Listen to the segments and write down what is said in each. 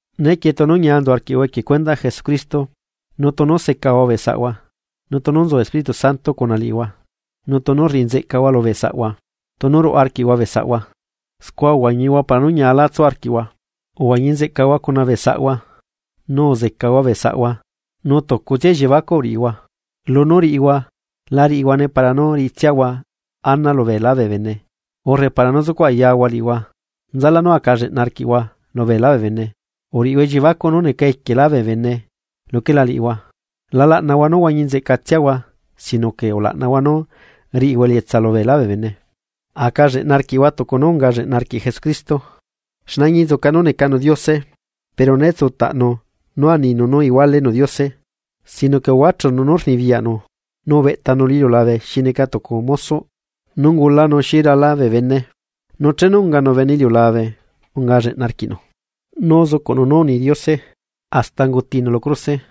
Nequie tunu ñia nzu arquiꞌhua equie cuendaꞌ Jesucristo, nu tunu secahua bee saꞌhua, nu tunu nzu Espíritu Santo cuna liꞌihua tunu rriꞌi nzeꞌcahua lubee saꞌahua, tunu ruaꞌa arquiꞌhua bee saꞌhua, scua uhuañihua para nú ñiala tsu arquia, uhuañi nzeꞌcahua cuna bee saꞌhua, nu uzecahua bee saꞌhua nu tucutsia elliebacuꞌ uriꞌihua. Lunú riꞌihua, la riꞌihuane para nú riꞌitsiahua ana lubeelá bee bene, urre para nú zucuꞌ ayahua liꞌihua nzalá nú aca lleꞌna arquiꞌhua lubeelá bee bene uriꞌhua elliebacuꞌ nú neca equielá bee bene luquela liꞌihua. La laꞌnahua nú huañi nzeꞌca liꞌitsiahua, sino que ulaꞌnahua nú riꞌihua elietsa lu beelá bee bene. Aca lleꞌna arquiꞌhua tucu nú unga lleꞌna arquiꞌ Jesucristo, Xne añinzuca nú necanu Diose pero né tsutaꞌnu nú aninu nú igualenu Diose. Sino que uhuachunu nú rnibiyaꞌnu, nu ubeꞌtanu lu iliulabequieꞌ xi neca tucu mosoꞌ nu ungulanu xi rala bee bene. Nu chenu unganu bene iliulabe unga lleꞌna arquiꞌnu, nu uzucuꞌnu nú uni Diose, hasta ungutinu lu cruse.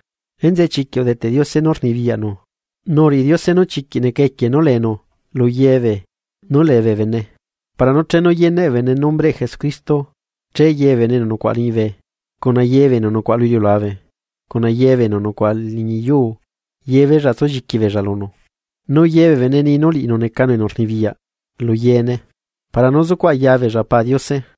Enzeꞌe chiquiꞌ udeteꞌ Diose nú rnibiyaꞌnu nu uriꞌi Diose nú chiquiꞌ neca equie nú leenu luyebee nú lee bee bene. Para nú chenu yeneꞌ bee bene nombreꞌ Jesucristo, che ye bee bene enu nucuaꞌa liñibe, cuna ye bee enu nucuaꞌa lu iliulabe, cuna ye bee enu nucuaꞌa liñi yuu, yebeella tsulliqui beella lunu. Nu ye bee bene nii nú liꞌinu necanu enu rnibiyaꞌ lu yeene para nú zucuꞌ ayabeella Pa Diose.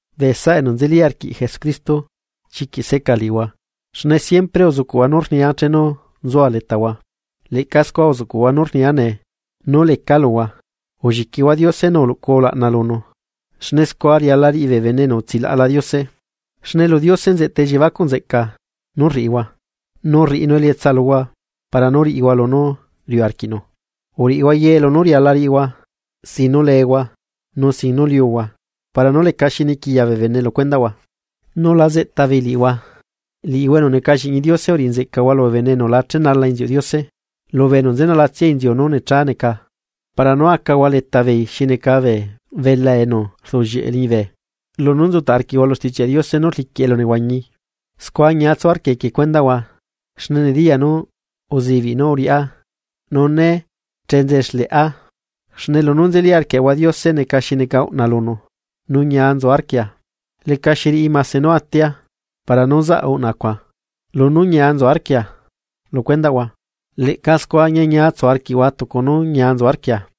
Bee saꞌa enu nzeli arquiꞌ Jesucristo chiquiꞌ seꞌca liꞌihua, xne siempre uzucuꞌhua nú rnia chenu nzua letahua, leꞌca scua uzuꞌcuꞌhua nú rnia nee nú lecaa luhua. Ulliquihua Diose nu uluꞌcuhua ulaꞌna lunu, xne scua riala riꞌi bee bene enu utsilaꞌla Diose. Xne lu Diose nzeꞌta elliebacuꞌ nzeꞌca nú rriꞌihua, nu rriꞌinu elietsa luhua para nú riꞌihua lunú riuꞌ arquiꞌnu. Uriꞌihua ye lunú riala riꞌihua sin nú lehua, nu sin nú liuhua. Para nú lecaxi niquiya bee bene lu cuendaꞌhua nu la zeꞌta beei liꞌihua. Liꞌihua enu neca lliꞌñi Diose uriꞌi nzeꞌcahua lubee bene enu la chenala inziuꞌ Diose, lubee enu nzenalatsia inziu nú necha neca para nú acahua letabeei xi neca bee belá enu rduꞌllieꞌe liñibe. Lunú nzutaꞌ arquiꞌhua lu Stichiaꞌ Diose nú rliquiꞌ elu nehuañi. Scua ñia tsu arquia equie cuendaꞌhua xne nediyaa nú uzibiꞌ nú uriꞌá nu né chenze xleꞌa. Xne lunú nzeli arquiaꞌahua Diose neca xi neca uꞌna lunu, nu ñia nzu arquia. Lecaxi riꞌi mase nú atia para nú zaꞌ uꞌna cuaꞌ, lunú ñia nzu arquia lu cuendaꞌhua. Leꞌca scua ñiañia tsu arquiꞌhua tucu nú ñia nzu arquia.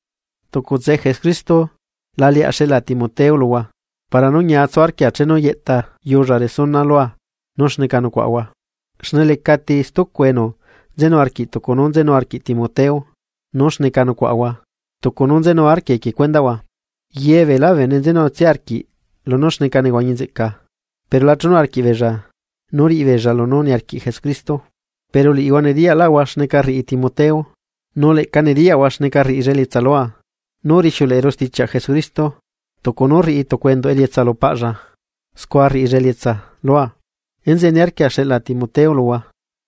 Tucutse Jesucristo laleaꞌ xeꞌla Timoteo luhua para nú ñia tsu arquia chenu yeꞌtayulla resuna lua nú xneca nucuaꞌahua. Xne lecati stucu enu nzenu arquiꞌ tucu nú nzenu arquiꞌ Timoteo nú xneca nucuaꞌahua tucu nú nzenu arquia equie cuendaꞌhua; ye beelá bee bene nzenutsia arquiꞌ lunú xneca nehuañi nzeꞌca, pero la chenu arquiꞌbeella nú riꞌibeella lunú niarquiꞌ Jesucristo. Pero liꞌihua nediyaꞌlaꞌhua xneca rriꞌi Timoteo, nu leꞌca nediyaꞌhua xneca rriꞌilla elietsa lua nú rixiuleꞌeru stichiaꞌ Jesucristo, tucu nú rriꞌi tucu enduꞌ elietsa lu paꞌlla scua rriꞌilla elietsa lua. Enzeꞌe niarquia xeꞌla Timoteo luhua,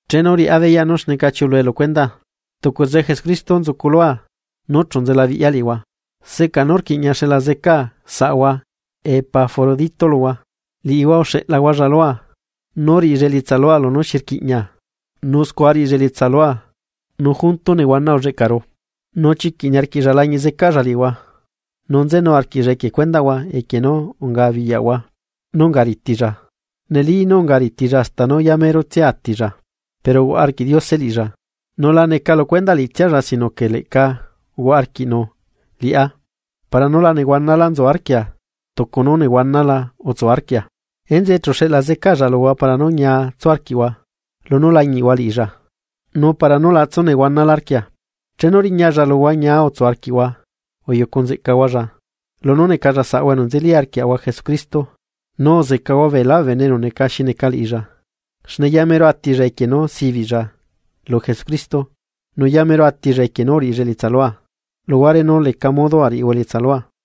chenu riꞌá beyaꞌ nú xneca chiulue lu cuendaa. Tucutse Jesucristo nzuculua nú chu nzelabiꞌya liꞌihua. Seꞌca nú rquiꞌña xeꞌla zeca saꞌahua Epafrodito luhua, liꞌihua uxeꞌlahualla lua nú riꞌilla elietsaa lunú xi rquiꞌña. Nu scua rriꞌilla elietsa lua nu junto nehuana ulleꞌcaru. Nu chiquiꞌ niarquiꞌlla lañiꞌ zecaꞌlla liꞌihua, nu nzenu arquiꞌlla equie cuendaꞌhua equie nú unga biyaꞌhua nú unga ritilla. Neli nú unga ritilla hasta nú yamerotsia atilla. Pero uhuaꞌa arquiꞌ Diose liꞌilla, nu la neca lu cuendaꞌ liꞌitsialla sino que leꞌca uhuaꞌa arquiꞌnu liꞌá, para nú la nehuanalá nzu arquia tucu nú nehuanala utsu arquia, enzeꞌe chu xeꞌla zecalla luhua para nú ñia tsu arquiꞌhua, lunú lañiꞌhua liꞌilla, nu para nú la tsunehuanalá arquia. Chenu riñalla luhua ñia utsu arquiꞌhua uyucu nzeꞌcahualla, lunú necalla saꞌahua enu nzeli arquiaꞌahua Jesucristo, nu uzecahua beelá bee bene enu neca xi neca liꞌilla. Xne yamero atilla equie nú sibiꞌlla lu Jesucristo, nu yamero atilla equie nú uriꞌilla elietsa lua, luhuare nú leca modo ariꞌihua elietsa lua.